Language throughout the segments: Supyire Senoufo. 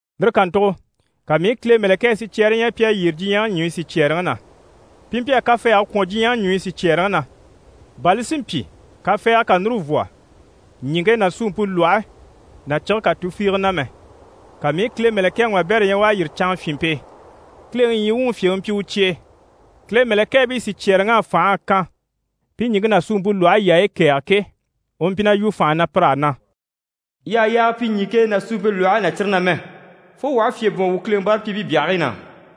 Lire kàntugo ka mii i Kile mɛ̀lɛkɛɛ sicyɛɛre ɲya pi à yyére diɲyɛŋi ɲùɲyi sicyɛɛreŋi na. Pi mpyi a kafɛɛge kwɔ̀n diɲyɛŋi ɲùɲyi sicyɛɛreŋi na, bà li si mpyi kafɛɛgɛ kà núru vwɔ ɲìŋke ná suumpe lwɔhe ná cige kà tufiige na mɛ. Ka mii i Kile mɛ̀lɛkɛŋi wabɛrɛ ɲya u à yîri canŋafyinmpe e. Kileŋi ɲyii wuŋi fyèŋi mpyi u cye e. Kile mɛ̀lɛkɛɛbii sicyɛɛreŋ'á fành'à kan pi ɲìŋke ná suumpe lwɔhe yaayi kɛ̀ɛge ke, u mpyi na yu fànha na pir'á na: «Yii àha yaaga pyi ɲìŋke ná suumpe lwɔhe ná cire na mɛ, fo wuu aha fyè bwɔ̀n wuu Kileŋi báarapyiibii byahigii na.»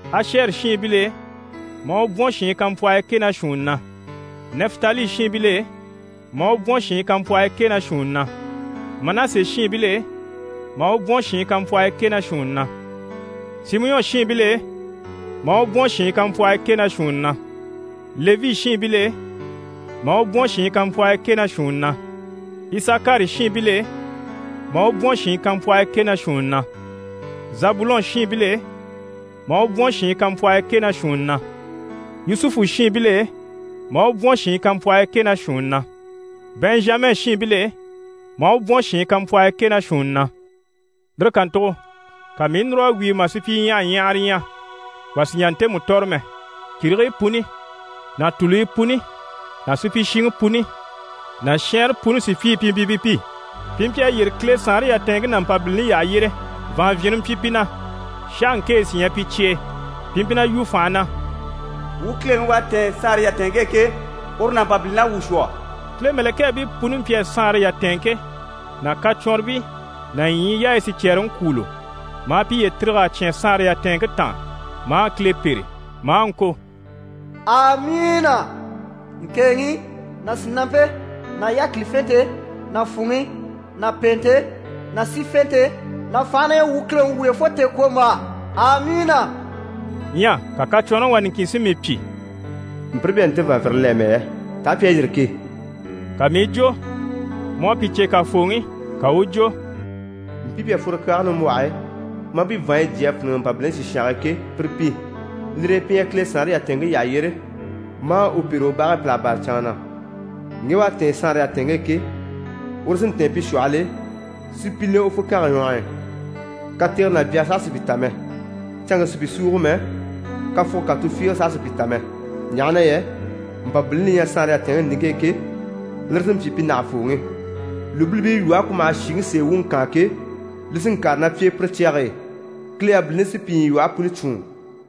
Ashɛri shiinbil'e, maa u bwɔ̀n shiin kampwɔhii kɛ ná shuunni na, Nɛfitali shiinbil'e, maa u bwɔ̀n shiin kampwɔhii kɛ ná shuunni na, Manase shiinbil'e, maa u bwɔ̀n shiin kampwɔhii kɛ ná shuunni na, Simiyɔn shiinbil'e, maa u bwɔ̀n shiin kampwɔhii kɛ ná shuunni na, Levi shiinbil'e, maa u bwɔ̀n shiin kampwɔhii kɛ ná shuunni na, Isakari shiinbil'e, maa u bwɔ̀n shiin kampwɔhii kɛ ná shuunni na, Zabulɔn shiinbil'e, maa u bwɔ̀n shiin kampwɔhii kɛ ná shuunni na, Yusufu shiinbil'e, maa u bwɔ̀n shiin kampwɔhii kɛ ná shuunni na, Bɛnzhama shiinbil'e, maa u bwɔ̀n shiin kampwɔhii kɛ ná shuunni na. Lire kàntugo ka mii i núr'a wíi mà sùpyiɲyahaɲyahara ɲya wà sì n‑jà ntemu tɔ̀rɔ mɛ. Kìrigii puni ná tùluyi puni ná supyishiŋi puni ná shɛɛnre puni sùpyii pi mpyi pi pi. Pi mpyi a yyére Kile saanre yatɛɛnŋke ná Mpabilini yyaha yyére. Vàanvyinre mpyi pi na, sháhaŋkenyɛ sí ɲyɛ pi cye e. Pi mpyi na yu fànha na: «Wuu Kileŋi u à tɛ̀ɛn saanre yatɛɛnŋke e ke, uru ná Mpabilini à wuu shwɔ.» Kile mɛ̀lɛkɛɛbii puni mpyi a saanre yatɛɛnŋke ná kacwɔnribii ná ɲyii yaayi sicyɛɛreŋi kwûulo, maa piye tîrig'a cyán saanre yatɛɛnŋke taan, maa Kile pêre, maa ŋko: «Amiina! Ŋkèeŋi ná sìnampe ná yákilifente ná fwùŋi ná pèente ná sífente ná fànhe na ɲyɛ wuu Kileŋi wuyo fo tèekwombaa. Amiina.» Ɲyɛ ka kacwɔnrɔŋi wà niŋkin si mii pyi: «Mpire pi à nte vàanvyinre le amɛ yɛ, taa pi à yîri ke?» Ka mii i jwo: «Mu à pi cè kàfooŋi.» Ka u u jwo: «Mpii pi à fworo kyaage nimbwɔhe e, maa pi vàanɲyi jyé a fíniŋɛ Mpabilini sìshange e ke, pire pi. Lire e, pi ɲyɛ Kile saanre yatɛɛnŋke yyaha yyére, maa u pêre u bage e pìlaga bâra canŋa na. Ŋge u à tɛ̀ɛn saanre yatɛɛnŋke e ke, uru sí n‑tɛ̀ɛn pi shwɔhɔl'e, si pi le u fukange ɲwɔh'i. Katege ná byage saha sì pi ta mɛ. Canŋke sì pi súugo mɛ, kafuge kà tufiige saha sì pi ta mɛ, ɲaha na yɛ Mpabilini li ɲyɛ saanre yatɛɛnŋke nìŋke e ke, lire sí n‑pyi pi nàhafooŋi. Lùbilibii lwɔhe ku maha shìŋi sèe wuŋi kaan ke, li sí n‑kàre ná pi e pire cyage e. Kile yabiliŋi sí pi ɲyilwɔhe puni cwûun.»